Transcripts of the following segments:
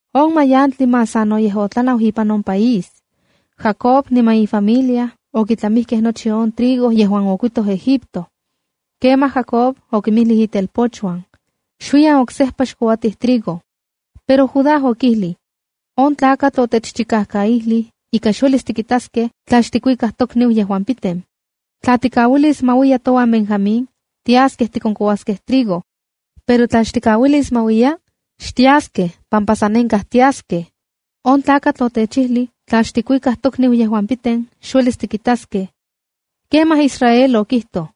On mayantli más sanoyej otlanau ipan on país. Jacob niman ifamilia okitlamijkej nochi on trigo yejuan okuitoj Egipto. Kemaj Jacob okinmijlij itelpochuan: —Xuiyan oksejpa xkouatij trigo. Pero Judá okijlij: —On tlakatl otechchikajkaijlij ika xuelis tikitaskej tla xtikuikaj tokniu piten. Tla tikauilis ma uiya touan Benjamín, tiaskej tikonkouaskej trigo. Pero tla xtikauilis ma uiya, xtiaskej pampa san nenkaj. On tlakatl otechijlij tla xtikuikaj tokniu piten, xuelis tikitaskej. Kemaj Israel okijtoj: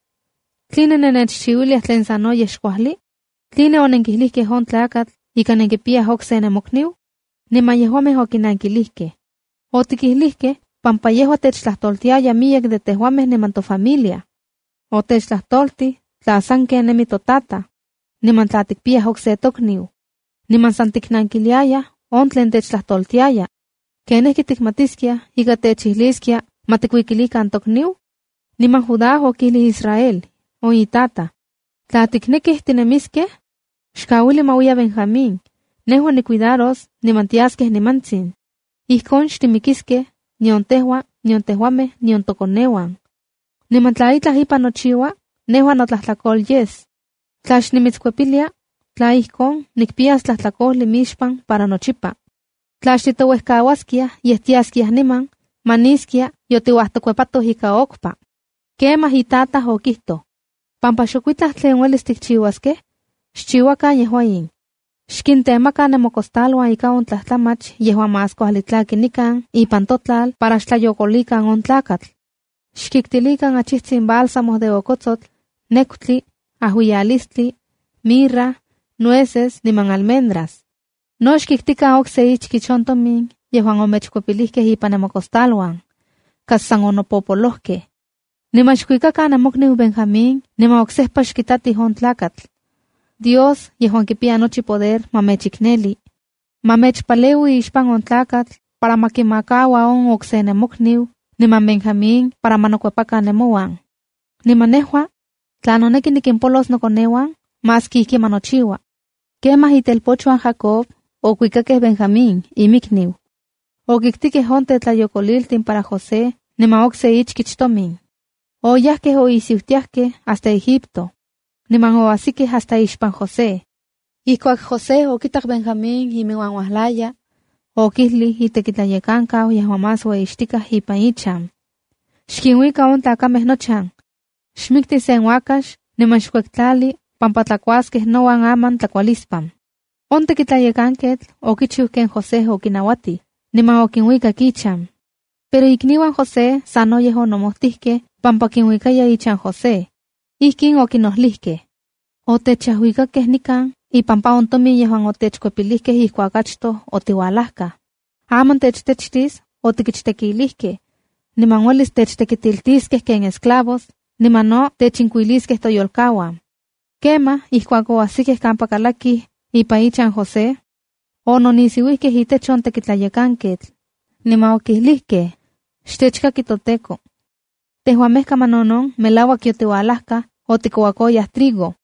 —¿Tline nennechchiuiliaj tlen sanoyej xkuajli? ¿Tline onenkijlijkej on tlakatl ika nenkipiyaj okse nemokniu? Niman yejuamej okinankilijkej: —Otikijlijkej pampa yejua techtlajtoltiaya miyek de tejuamej niman tofamilia. Otechtlajtoltij tla saken nemi totataj, niman tla tikpiyaj okse tokniu. Niman san tiknankiliayaj on tlen techtlajtoltiaya. ¿Ken ijki tikmatiskiaj ika techijliskia ma tikuikilikan tokniu? Niman Judá okijlij Israel, on itataj: —Tla tiknekij tinemiskej, xkauili ma uiya Benjamín. Nejua nicuidaros niman tiaskej nimantsin. Ijkon xtimikiskej, nion tejua, nion tejuamej, nion tokoneuan. Niman tla itlaj ipan nochiua, nejua notlajtlakol yes. Tla xnimitskuepilia, tla ijkon, nikpiyas tlajtlakojli mixpan para nochipa. Tla xtitouejkauaskiaj, yej tiaskiaj niman, maniskia yotiuajtokuepatoj ika okpa. Kemaj itataj okijtoj: —Pampa xokuitlaj tlen uelis tikchiuaskej, xchiuakan yejua in: Xkintemakan nemocostaluan ika on tlajtlamach yejuan más kuajli tlaki nikan ipan totlal para xtlayokolikan on tlakatl. Xkiktilikan achijtsin bálsamo de okotsotl, nekutli, ajuialistli, mirra, nueces niman almendras. No xkiktikan okse ichkich on tomin yejuan omechkuepilijkej ipan nemocostaluan. Kas san onopopolojkej. Niman xkuikakan nemokniu Benjamín niman oksejpa xkitatij on tlakatl. Dios yejuan kipiya nochi poder ma mechikneli. Ma mechpaleui ixpan on tlakatl para ma kimakaua on okse nemokniu niman Benjamín para ma nokuepakan nemouan. Niman nejua, tla noneki nikimpolos nokoneuan, maski ijki ma nochiua. Kemaj itelpochuan Jacob okuikakej Benjamín inmikniu. Okiktikej on tetlayokoliltin para José niman okse ichkich tomin. Oyajkej oisiutiajkej hasta Egipto. Ompa oasijkej hasta ixpan José. Ijkuak José okitak Benjamín iminuan uajlaya, okijlij itekitlayekankau yejuan más ueyixtikaj ipan ichan: —Xkinuika in tlakamej nochan. Xmikti sen uakax niman xkuektlali pampa tlakuaskej nouan aman tlakualispan. On tekitlayekanketl okichiu ken José okinauatij, niman okinuikak ichan. Pero ikniuan José sanoyej onomojtijkej pampa kinuikayaj ichan José. Ijkin okinojlijkej: —Otechajuikakej nikan ipampa on tomin yejuan otechkuepilijkej ijkuak achtoj otiualajkaj. Aman techtechtis otikichtekilijkej, niman uelis techtekitiltiskej ken esclavos, niman no techinkuiliskej toyolkauan. Kemaj ijkuak oajsikej kampa kalakij ipan ichan José, ononisiuijkej itech on tekitlayekanketl, niman okilijkej: —¡Xtechkaki toteko! Tejuamej kamanonon melauak yotiualajkaj otikouakoyaj trigo.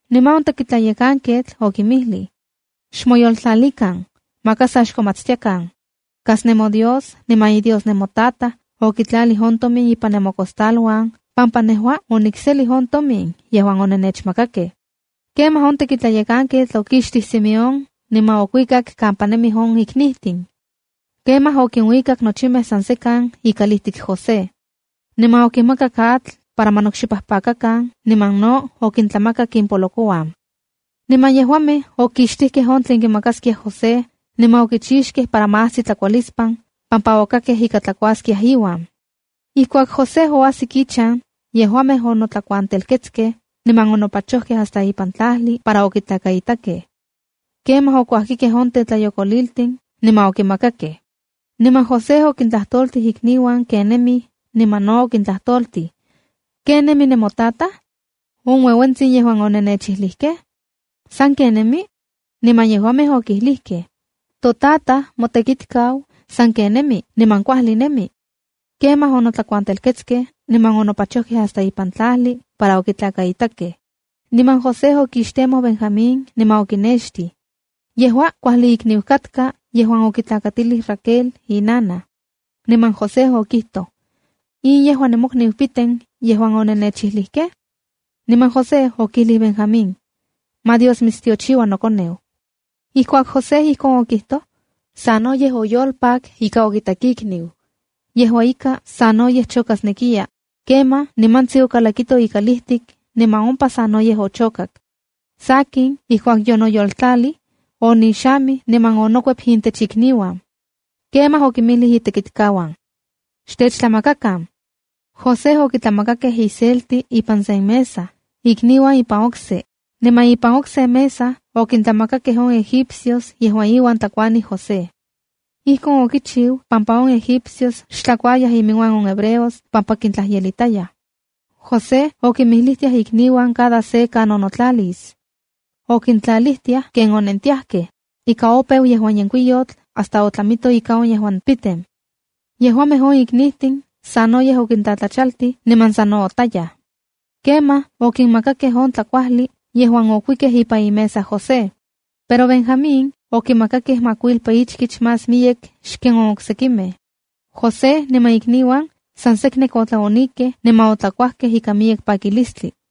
Niman on tekitlayekanketl okinmijlij: —Xmoyoltlalikan. Maka sa xkomatstiakan. Kas nemoDios niman iDios nemotataj okitlalij on tomin ipan nemocostaluan pampa nejua onikselij on tomin yejuan onenechmakakej. Kemaj on tekitlayekanketl okixtij Simeón niman okuikak kampa nemij on iknijtin. Kemaj okinuikak nochimej san sekan ikalijtik José. Niman okinmakak atl para ma nokxipajpakakan niman no okintlamakak impolokouan. Niman yejuamej okuektlalijkej on tlen kimakaskiaj José, niman okichixtijkej para ma ajsi tlakualispan pampa okakkej ika tlakuaskiaj iuan. Ijkuak José oajsik ichan, yejuamej onotlakuantelketskej niman onopachojkej hasta ipan tlajli para okitlakaitakej. Kemaj okuajkikej on tetlayokoliltin niman okimakakej. Niman José okintlajtoltij ikniuan ken nemij niman no okintlajtoltij: —¿Ken nemi nemotataj, on ueuentsin yejuan onennechijlijkej? ¿Sanken nemi? Niman yejuamej okilijkej: —Totataj, motekitkau, sanken nemi niman kuajli nemi. Kemaj onotlakuantelketskej niman onopachojkej hasta ipan tlajli para okitlakaitakej. Niman José okixtemoj Benjamín niman okinextij. Yejua kuajli ikniu katka yejuan okitlakatilij Raquel inanaj. Niman José okijtoj: —¿In yejua nemokniu piten yejuan onennechijlijkej? Niman José okijlij Benjamín: —¡Ma Dios mitstiochiua nokoneu! Ijkuak José ijkin okijtoj, sanoyej oyolpak ika okitak ikniu. Yejua ika, sanoyej chokasnekiya, kemaj nimantsin okalakito ikalijtik niman ompa sanoyej ochokak. Sakin, ijkuak yonoyoltlalij, onixamij niman onokuep intech ikniuan. Kemaj okinmijlij itekitkauan: “¡Xtechtlamakakan!” José okitlamakakej iselti ipan sen mesa, ikniuan ipan okse, niman ipan okse mesa okintlamakakej on egipcios yejuan iuan tlakuanij José. Ijkon okichiu pampa on Egipcios xtlakuayaj iminuan on hebreos pampa kintlajyelitayaj. José okinmijlijtiaj ikniuan cada se kanon notlalis. Okintlatlalijtiaj ken onentiajkej, ika opeu yejuan yenkuiyotl hasta otlamito ika on yejuan piten. Yejuamej on iknijtin sanoyej okintlatlachaltij niman sa nootayaj. Kemaj okinmakakej on tlakuajli yejuan okuikej ipan imesa José. Pero Benjamín okimakakej makuilpa ichkich más miyek xken on oksekimej. José niman ikniuan san seknek otlaonikej niman otlakuajkej ikan miyek pakilistli.